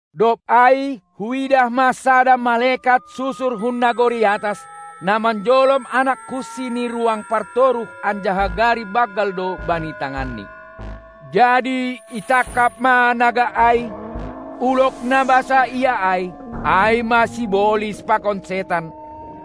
Dob ai huidah ma sada malekat susur hun nagori atas, na manjolom anak kunsi ni ruang partoruh anjaha gari banggal do bani tanganni. Jadi itangkap ma naga ai, ulog na basaia ai, ai ma sibolis pakon setan,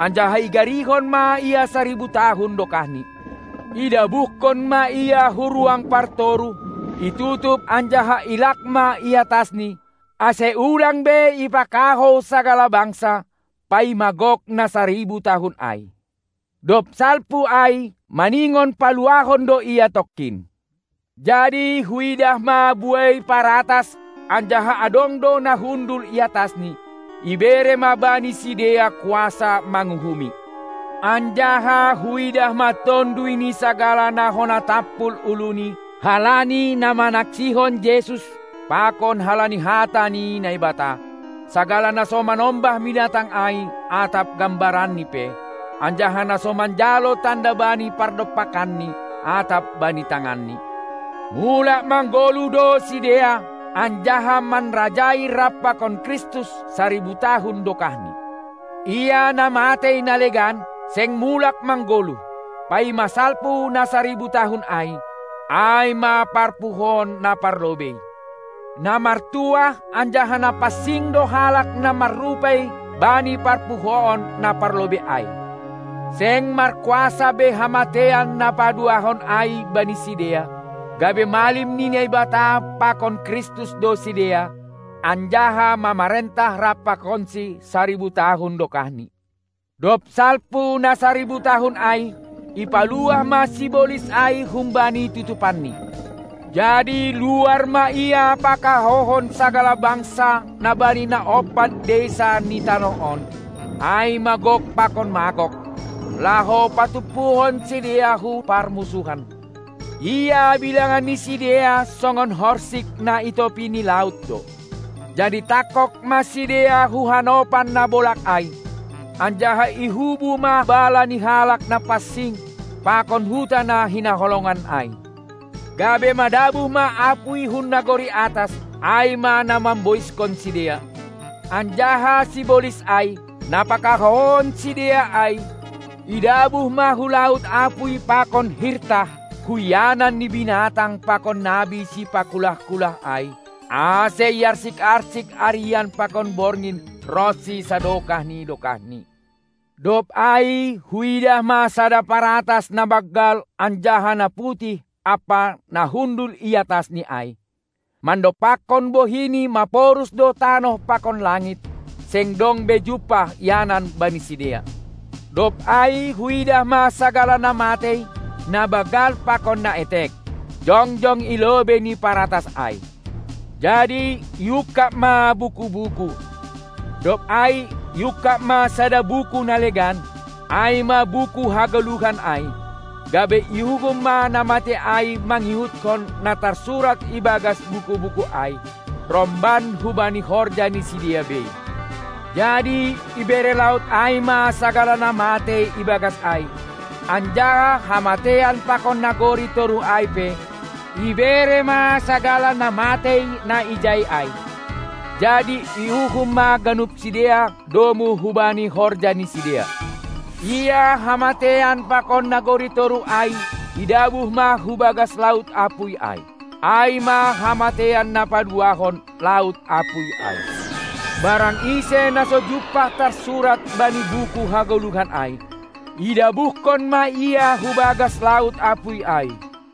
anjaha igarihon ma ia saribu tahun dokahni. Idabuhkon ma ia hu ruang partoruh, itutup anjaha ilak ma i atasni, ase ulang be ipakahou sagala bangsa, paima gok na saribu tahun ai. Dob salpu ai maningon paluahon do ia tongkin. Jadi huidah ma buei paratas anjaha adong do na hundul i atasni, ibere ma bani sidea kuasa manguhumi. Anjaha huidah ma tonduy ni sagala na hona tampul uluni halani na manaksihon Jesus pakon halani hata ni Naibata, sagala na so manombah binatang ai atap gambaranni pe, anjaha na so manjalo tanda bani pardompakanni atap bani tanganni. Mulak manggoluh do sidea anjaha manrajai rap pakon Kristus saribu tahun dokahni. Ia na matei na legan, seng mulak manggoluh, paima salpu na saribu tahun ai. Ai ma parpuhoon na parlobei. Na martuah anjaha na pansing do halak na marrupei bani parpuhoon na parlobei ai. Seng markuasa be hamateian na paduahon ai bani sidea, gabe malim ni Naibata pakon Kristus do sidea anjaha mamarentah rap pakonsi saribu tahun dokahni. Dob salpu na saribu tahun ai, ipaluah ma sibolis ai humbani tutupanni. Jadi luar ma ia pakahouhon sagala bangsa na bani na ompat deisa ni tanoh on, ai ma Gok pakon Magog, laho patumpuhon sidea hu parmunsuhan; ia bilangan ni sidea songon horsik na i topi ni laut do. Jadi tangkog ma sidea hu hanopan na bolag ai, anjaha ihubu ma bala ni halak na pansing pakon huta na hinaholongan ai; gabe madabuh ma apuy hun nagori atas, ai ma na mamboiskon sidea. Anjaha sibolis ai, na pakahouhon sidea ai, idabuh ma hu laut apuy pakon hirtah, hu ianan ni binatang pakon nabi sipakulah-kulah ai, ase iarsik-arsik arian pakon borgin ronsi sadokah ni dokahni. Dob ai huidah ma sada paratas na banggal anjaha na putih ampa Na hundul i atasni ai. Mandompakkon bohini maporus do tanoh pakon langit, seng dong be jumpah ianan bani sidea. Dob ai huidah ma sagala na matei, na banggal pakon na etek, jongjong i lobei ni paratas ai; jadi iungkab ma buku-buku. Dob ai iungkab ma sada buku na legan, ai ma buku hagoluhan ai, gabe iuhum ma na matei ai mangihutkon na tarsurat ibagas buku-buku ai, romban hubani horja ni sidea bei. Jadi ibere laut ai ma sagala na matei ibagas ai, anjaha hamateian pakon nagori toruh ai pe ibere ma sagala na matei na ijai ai; jadi iuhum ma ganup sidea domu hubani horja ni sidea. Ia hamateian pakon nagori toruh ai idabuh ma hubagas laut apuy ai. Ai ma hamateian na paduahon, laut apuy ai. Barang ise na so jumpah tarsurat bani buku hagoluhan ai, idabuhkon ma ia hubagas laut apuy ai.